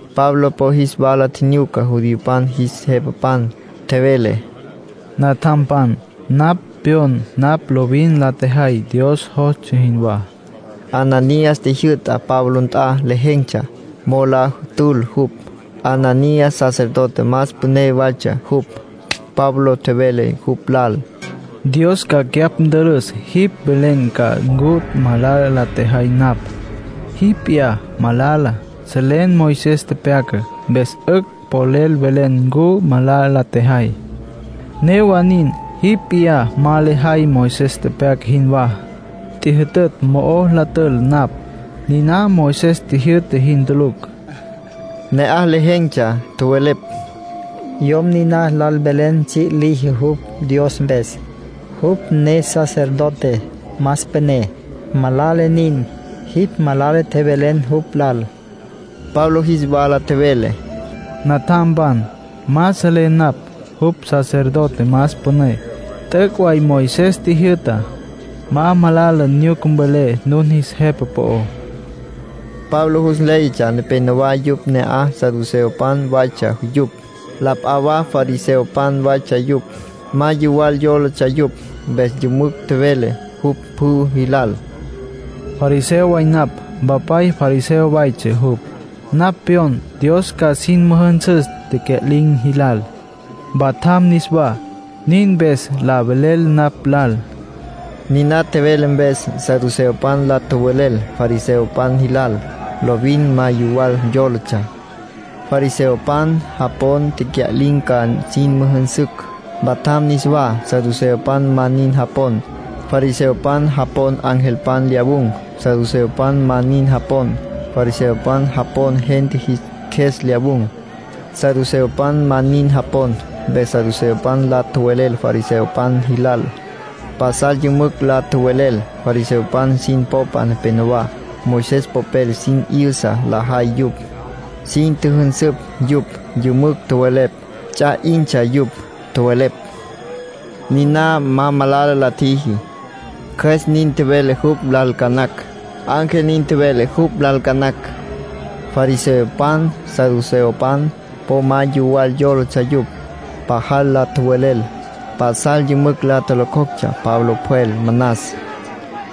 Pablo po jis wala tjinyuca judiopan jis jepapan. Tjevele: —Natjampan, napj pyon napj lovin la tjejay Dios jostsja jinwá. Ananías tjijyü'ta Pablo nt'a lejen̈tsja mo'o la tül jupj. Ananías sacerdote más püné waytsja jupj. Pablo tjevele jupj lal: —Dios ca cyapj ntülüs. Jipj mvelen ca ncu malala la tjejay napj. Jipj p'iyá malala. Selen Moisés tepyacá, mpes 'ücj polel velen ncu malala la tjejay. Newa nin, jipj p'iyá ma lejay Moisés tepyaca jinwá. Tjijyütütj mo'o la tül napj, niná Moisés tjijyü'ta jin tulucj. Ne'aj lejen̈tsja tjowelepj: —Yom niná lal velen tsji' liji jupj Dios mpes. Jupj ne sacerdote más püné. Malala nin, jipj malala tjevelen jupj lal —nin tjowelepj. Pablo jis wala tjevele: —Natjampan, ma seletsja napj jupj sacerdote más püné. T'üc' way Moisés tjijyü'ta: ‘Ma malala nyuca mvelé nun jis jepa po'ó’. Pablo jus nléyatsja nepénowa yupj ne'aj saduceopan waytsja yupj, la p'a wa fariseopan waytsja yupj. Ma yuwal yólatsja yupj. Mpes yümücj tjevele jupj pjü jilal: —Fariseo way napj. Mpapay fariseo waytsja jupj. Napj pyon Dios ca sin müjünsüs tecya'lin̈ jilal, mpatjam niswá. Nin mpes la velel napj lal —nin tjevele Pablo. Niná tjevele mpes, saduceopan la tjowelel fariseopan jilal. Lovin ma yuwal yólatsja. Fariseopan japon tecya'lin̈ ca sin müjünsücj, mpatjam niswá. Saduceopan ma nin japon. Fariseopan japon angelpan lyawun̈. Saduceopan ma nin japon. Fariseopan japon gente jis qjues lyawun̈. Saduceopan ma nin japon. Mpes saduceopan la tjowelel fariseopan jilal. Pasal yümücj la tjowelel. Fariseopan sin popa nepenowá, Moisés popel sin 'yüsa lajay yupj, sin tjüjünsüpj yupj, yümücj tjowelepj. Ts'a 'intsja yupj. Tjowelepj: “Niná ma malala la tjiji. Cjües nin tjevele jupj lal ca nacj. Ángel nin tjevele jupj lal ca nacj.” Fariseopan, saduceopan, po ma yuwal yólatsja yupj. Pajal la tjowelel. Pasal yümücj la tjolocjoctsja Pablo pjwel manas.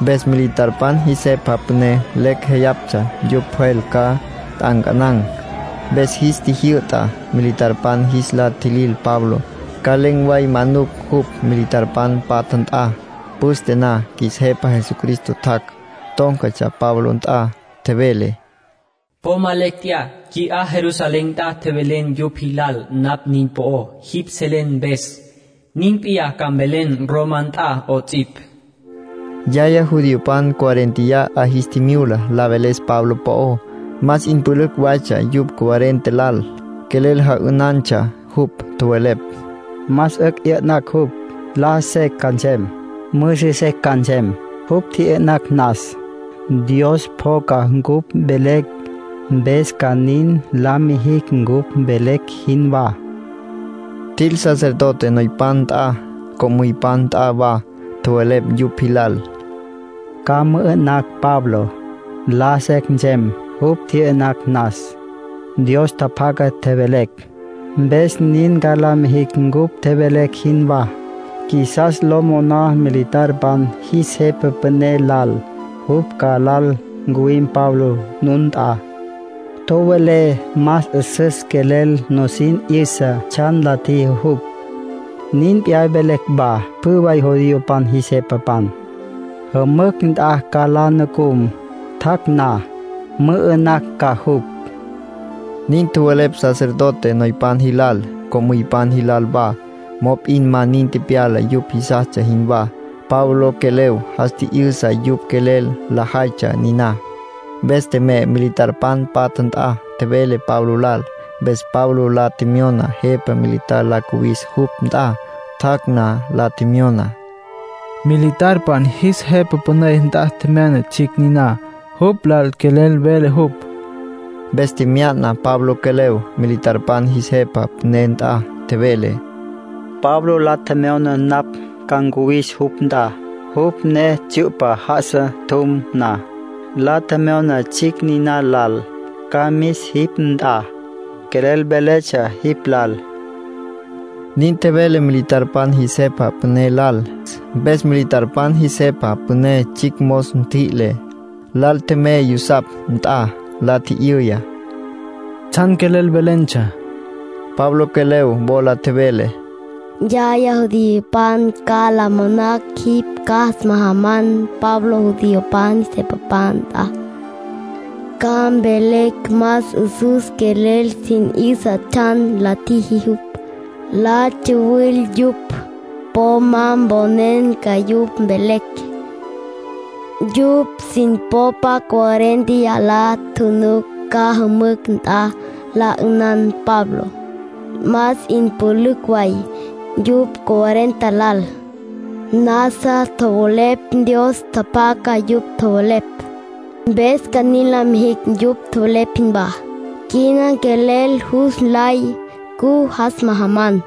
Mpes militarpan jis jepa püné lecj jéyatsja jupj pjwel ca nt'ancanan̈. Mpes jis tjijyü'ta militarpan jis la tjilil Pablo, ca len̈ way manucj jupj militarpan patja nt'a. Püste na, qjuis Jepa Jesucristo tjac', tón̈catsja Pablo nt'a. Tjevele: “Po ma lecj tjeyá. Qui'á Jerusalén nt'a tjevelen yupj jilal napj nin po'ó jipj selen mpes. Nin p'iyá ca mvelen Roma nt'a 'ots'ipj”, nin tjevele. Yaya judiopan cuarénteya 'a jis tjimyula la veles Pablo po'ó. Más 'in pülücj waytsja yupj cuarenta lal. Quelel ja'ünantsja jupj. Tjowelepj: “Más 'ücj 'yü'nacj jupj. Laja secj ca nsem, müsü secj ca nsem, jupj tji'yü'nacj nas. Dios pjoca cupj velecj. Mpes ca nin la mijicj cupj tjevelecj jinwá.” Tjil sacerdote noypan nt'a, co'müypan nt'a wa. Tjowelepj yupj jilal: —Ca mü'ü'nacj Pablo. Laja secj nsem, jupj tji'yü'nacj nas. Dios tjapjaca tjevelecj, mpes nin ca la mijicj cupj tjevelecj jinwá. Qjuisas lo moná militarpan jis jepa püné lal jupj ca lal ncuwim Pablo nun nt'a. Tjowelé más 'üsüs quelel nusin 'yüsa tsjan la tjiji jupj. Nin p'iyá mvelecj wa pjü way judiopan jis jepapan. Jümücj nt'a ca la nucum. Tjac' na, mü'ü'nacj ca jupj —nin tjowelepj sacerdote noypan jilal, co'müypan jilal wa. Mop'in ma nin tepyala yupj jisastsja jinwá. Pablo quelev jas tji'yüsa yupj quelel lajaytsja niná. Mpes tjemey militarpan patja nt'a, tjevele Pablo lal. Mpes Pablo la tjemyona jepa militar la cuwis jupj nt'a. Tjac' na, la tjemyona: —Militarpan jis jepa püné nt'a tjemyana tsjicj niná. Jupj lal quelel vele jupj. Mpes tjemyana Pablo quelev militarpan jis jepa püné nt'a. Tjevele: —Pablo la tjemyona napj ca ncuwis jupj nt'a. Jupj ne tsyu'pa já'asa tjum na, la tjemyona tsjicj niná lal ca mis jipj nt'a. Quelel véletsja jipj lal —nin tjevele militarpan jis jepa püné lal. Mpes militarpan jis jepa püné tsjicj mos ntjüi'le, lal tjemey yusapj nt'a. La tji'yüya: —¿Tsjan quelel velentsja? Pablo quelev wola tjevele: —Yaya judiopan ca la monacj jipj ca jas majaman Pablo judiopan jis jepapan nt'a. Ca mvelecj yupj más 'üsüs quelel sin 'yüsa tsjan la tjiji jupj. La tsuwil yupj. Po ma mponen ca yupj mvelecj. Yupj sin popa cuarénteya la nucucj ca jümücj nt'a la 'ünan Pabló. Más 'in pülücj waytsja yupj cuarenta lal. Nasa tjowelepj Dios tjapjaca yupj tjowelepj, mpes nin ca la mijicj yupj tjowelepj jinwá. Quina quelel jus nlay ncu jas majaman.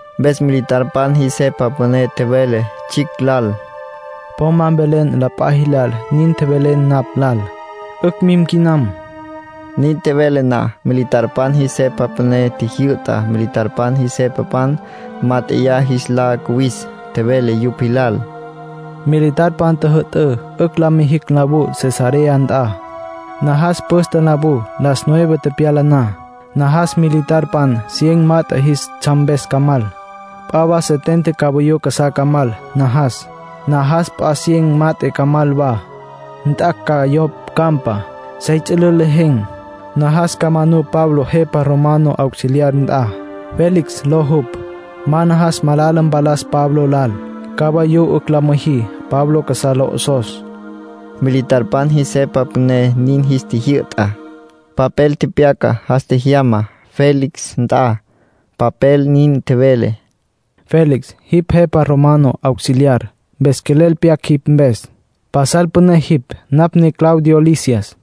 Mpes militarpan jis jepa püné tjevele tsjicj lal: —Po ma mvelen la p'a jilal nin tjevelen napj lal. 'Ücj mim quinam. Nin tjevele na, militarpan jis jepa püné tjijyü'ta militarpan jis jepapan mát'eya jis la cuwis. Tjevele yupj jilal: —Militarpan tjüjü'tǘ 'ücj la mijicj nlawú Cesarea nt'a. Najas püste nlawú, las nueve tepyala na. Najas militarpan cien mat'e jis tsjam mpes ca mal. P'a wa setenta cavayú casá ca mal, najas. Najas p'a cien mat'e ca mal wa, nt'acj ca yo campa, sey ts'ülül lejen̈. Najas ca manú Pablo jepa romano auxiliar nt'a, Félix ló jupj. Ma najas malala mpalas Pablo lal. Cavayú 'ücj la müjí Pablo casá lo 'osos —militarpan jis jepa püné nin jis tjijyü'ta. Papel tepyaca, jas tjejyama Félix nt'a. Papel nin tjevele: Félix, jipj jepa romano auxiliar, mpes quelel pyac jipj mpes. Pasal püné jipj. Napj ne Claudio Lisias.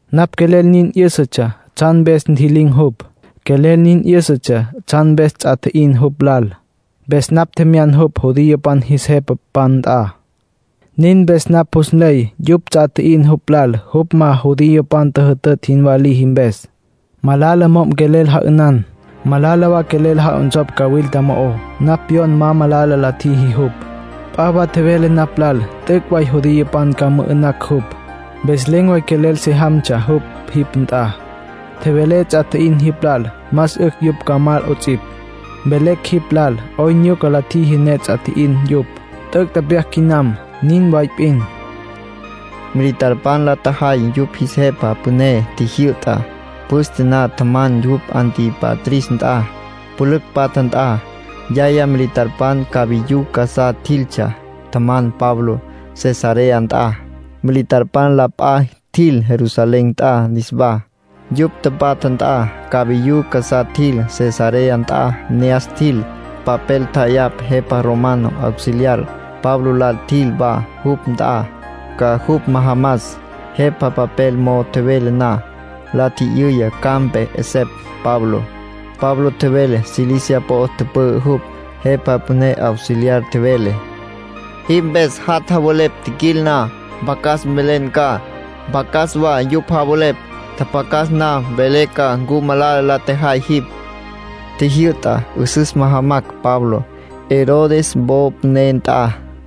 Napj quelel nin 'yǘsatsja tsjan mpes ntji'lin̈ jupj. Quelel nin 'yǘsatsja tsjan mpes ts'a tji'in jupj lal. Mpes napj tjemyan jupj judiopan jis jepapan nt'a. Nin mpes napj jus nley yupj ts'a tji'in jupj lal jupj ma judiopan tjüjütütj jinwá liji mpes. Malala mo'm quelel ja'ünan. Malala wa quelel ja'onsopj cawilta mo'ó. Napj pyon ma malala la tjiji jupj. P'a wa tjevele napj lal t'üc' way judiopan ca mü'ü'nacj jupj. Mpes len̈ way quelel se jamtsja jupj jipj nt'a. Tjevelé ts'a tji'in jilal más 'ücj yupj ca mal 'ots'ipj, mvelecj jipj lal 'oyn nyuca la tjiji ne ts'a tji'in yupj. T'üc' tepyac quinam. Nin way p'in. Militarpan la tjajay yupj jis jepa püné tjijyü'tá. Püste na tjaman jupj Antípatris nt'a, pülücj patja nt'a. Yaya militarpan cavayú casá tjiltsja tjaman Pablo Cesarea nt'a. Militarpan la p'a tjil Jerusalén nt'a niswá, yupj tapatja nt'a. Cabayú casá tjil Cesarea nt'a ne'as tjil. Papel tja'ayapj jepa romano auxiliar. Pablo lal tjil wa jupj nt'a, ca jupj majamas. Jepa papel mo'o tjevele na, la tji'yüya ca'ampe 'esepj Pablo. Pablo tjevele Cilicia po'o tüpü'ü jupj. Jepa püné auxiliar tjevele: “Jipj mpes jat' javelepj tjiquil na, mpjacas mvelen ca, mpjacas wa yupj javelepj. Tjapjacas na, mvelé ca ncu malala la tjejay jipj”, nin tjevele. Tjijyü'ta 'üsüs majamacj Pablo, Herodes wo püné nt'a.